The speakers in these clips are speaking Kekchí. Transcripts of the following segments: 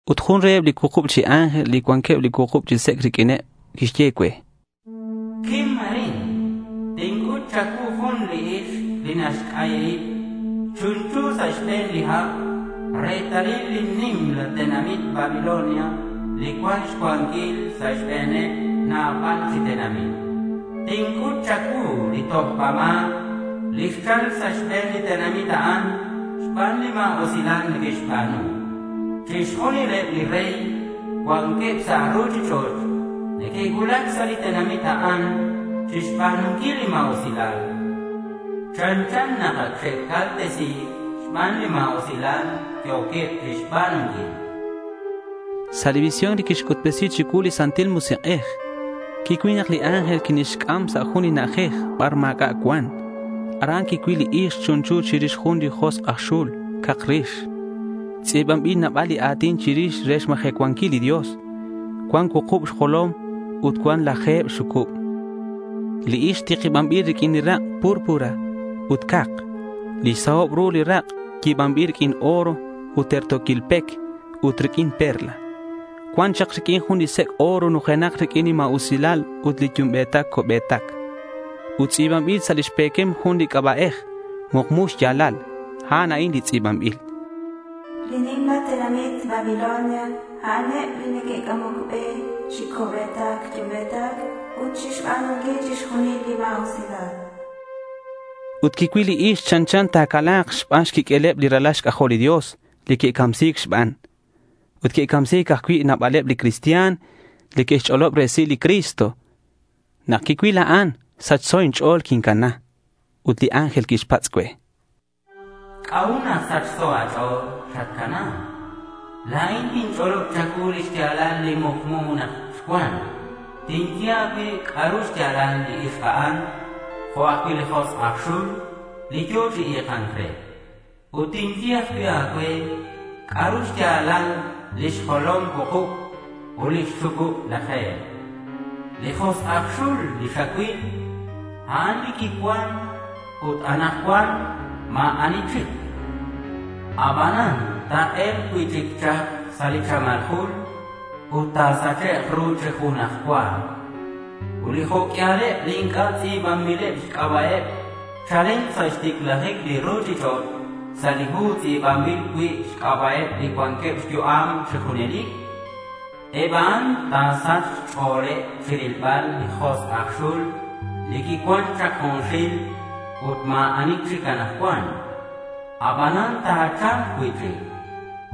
Ut jun reheb li cuukub chi ángel, li cuanqueb li cuukub chi sec' riq'uineb, quixye cue: —Quim arin. Tinc'ut cha̱cuu jun li ixk li naxc'ayi rib chunchu sa' xbe̱n li ha' retalil li nimal tenamit Babilonia li cuan xcuanquil sa' xbe̱neb nabal chi tenamit. Tinc'ut cha̱cuu li tojba ma̱c li xchal sa' xbe̱n li tenamit a'an xban li ma̱usilal neque'xba̱nu. Chixjunileb li rey li cuanqueb sa' ruchich'och' neque'cuulac sa' li tenamit a'an chixba̱nunquil li ma̱usilal. Chanchan nak ac xe'caltesi̱c xban li ma̱usilal yo̱queb chixba̱nunquil, chan li ángel. Sa' li visión li quixc'utbesi chicuu li Santil Musik'ej, quicuil nak li ángel quinixc'am sa' jun li na'ajej bar ma̱c'a' cuan. Aran quicuil li ixk chunchu chirix jun li josk' aj xul cak rix. Tz'i̱banbil nabal li a̱tin chirix re xmajecuanquil li Dios. Cuan cuukub xjolom ut cuan laje̱b xxucub. Li ixk tikibanbil riq'uin rak' púrpura ut cak. Lix sahob ru li rak' yi̱banbil riq'uin oro ut terto̱quil pec ut riq'uin perla. Cuan chak riq'uin jun li sec' oro nujenak riq'uin li ma̱usilal ut li yumbe̱tac co'be̱tac. Ut tz'i̱banbil sa' lix pe̱quem jun li c'aba'ej mukmu xya̱lal. A'an a'in li tz'i̱banbil: Li nimla tenamit Babilonia a'aneb li neque'c'amoc be chi co'be̱tac yumbe̱tac ut chixba̱nunquil chixjunil li ma̱usilal. Ut quicuil li ixk chanchan ta̱cala̱k xban xquiq'ueleb li ralal xc'ajol li Dios li que'camsi̱c xban. Ut que'camsi̱c ajcui' nabaleb li cristian li que'xch'olob resil li Cristo. Nak quicuil a'an, sachso inch'o̱l quincana. Ut li ángel quixpatz' cue: —¿C'a'ut nak sachso a̱ch'o̱l xatcana? La̱in tinch'olob cha̱cuu li xya̱lal li mukmu nak xcuan. Tinye a̱cue c'a'ru xya̱lal li ixk a'an jo' ajcui' li josk' aj xul li yo̱ chi i̱ka̱nc re. Ut tinye ajcui' a̱cue c'a'ru xya̱lal lix jolom cuukub ut lix xucub laje̱b. Li josk' aj xul li xacuil, a'an li quicuan, ut anakcuan ma̱ ani chic. Abanan ta̱e̱lk cui'chic chak sa' li chamal jul ut ta̱sachek' ru chi junaj cua. Ut li jo' q'uialeb li inc'a' tz'i̱banbileb xc'aba'eb chalen sa' xticlajic li ruchich'och' sa' li hu li tz'i̱banbil cui' xc'aba'eb li cuanqueb xyu'am chi junelic, eb a'an ta̱sachk xch'o̱leb chirilbal li josk' aj xul li quicuan chak junxil ut ma̱ ani chic anakcuan. Abanan ta̱cha̱lk cui'chic.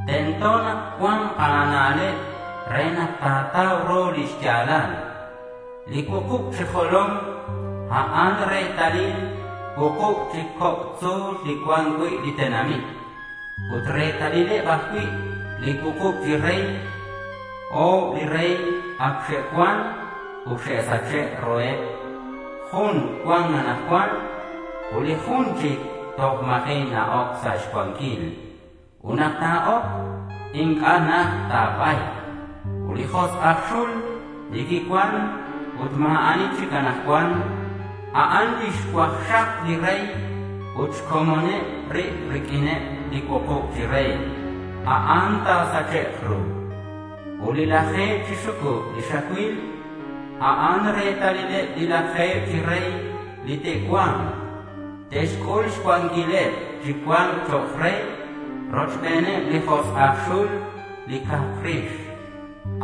Tento nak cua̱nk a̱na'leb re nak ta̱tau ru lix ya̱lal. Li cuukub chi jolom, a'an retalil li cuukub chi coc' tzu̱l li cuan cui' li tenamit. Ut retalileb ajcui' li cuukub chi rey. O̱b li rey ac xe'cuan ut xe'sache' ruheb, jun cuan anakcuan ut li jun chic toj ma̱ji' na-oc sa' xcuanquil. Ut nak ta̱oc, inc'a' najt ta̱ba̱yk. Ut li josk' aj xul li quicuan ut ma̱ ani chic anakcuan, a'an li xcuakxak li rey ut xcomoneb rib riq'uineb li cuukub chi rey. A'an ta̱sachek' ru. Ut li laje̱b chi xucub li xacuil, a'an retalileb li laje̱b chi rey li te'cua̱nk. Te'xc'ul xcuanquileb chi cua̱nc chok' rey, rochbeneb li josk' aj xul li cak rix.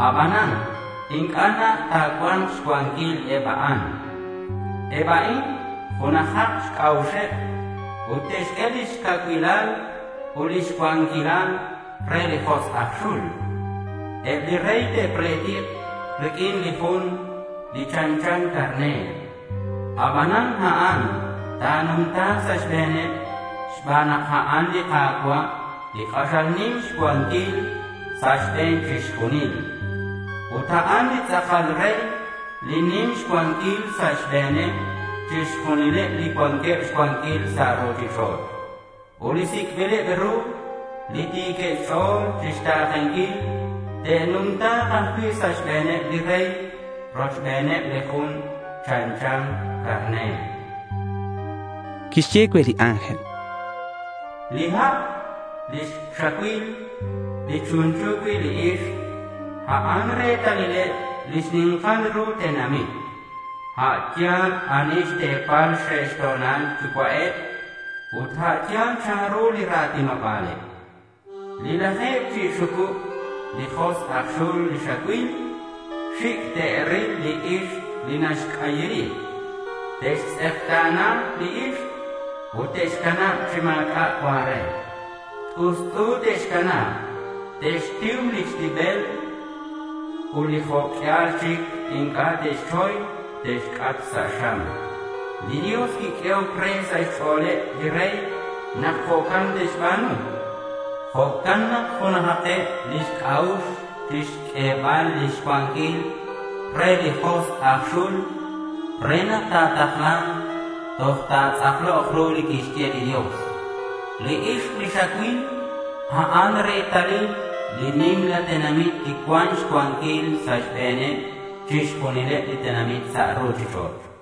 Abanan inc'a' najt ta̱cua̱nk xcuanquil eb a'an. Eb a'in junajak xc'a'uxeb ut te'xq'ue lix cacuilal ut lix cuanquilal re li josk' aj xul. Eb li rey te'pletik riq'uin li Jun li chanchan carner. Abanan a'an ta̱numta̱k sa' xbe̱neb xban nak a'an li Ka̱cua', li k'axal nim xcuanquil sa' xbe̱n chixjunil. Ut a'an li tz'akal rey li nim xcuanquil sa' xbe̱neb chixjunileb li cuanqueb xcuanquil sa' ruchich'och'. Ut li sic'bileb ru, li ti̱queb xch'o̱l chixta̱kenquil, te'numta̱k ajcui' sa' xbe̱neb li rey, rochbeneb li Jun li chanchan carner.— Quixye cue li ángel: —Li ha' li xacuil li chunchu cui' li ixk, a'an retalileb li xni̱nkal ru tenamit, a' yal ani xte̱paleb xxe'to̱nil yucua'eb, ut a' yal chanru li ra̱tinoba̱leb. Li laje̱b chi xxucub li josk' aj xul li xacuil, xic' te'ril li ixk li naxc'ayi rib. Te'xtz'ekta̱na li ixk ut te'xcanab chi ma̱c'a' cuan re. T'ust'u te'xcanab. Te'xtiu lix tibel ut li jo' q'uial chic inc'a' te'xchoy te'xc'at sa' xam. Li Dios quiq'uehoc re sa' xch'o̱leb li rey nak jo'can te'xba̱nu. Jo'can nak junajakeb lix c'a'ux chixq'uebal lix cuanquileb re li josk' aj xul re nak ta̱takla̱nk toj ta̱tz'aklok ru li quixye li Dios. Li ixk li xacuil, a'an retalil li nimla tenamit, li cuan xcuanquil sa' xbe̱neb chixjunileb li tenamit sa' ruchich'och'.—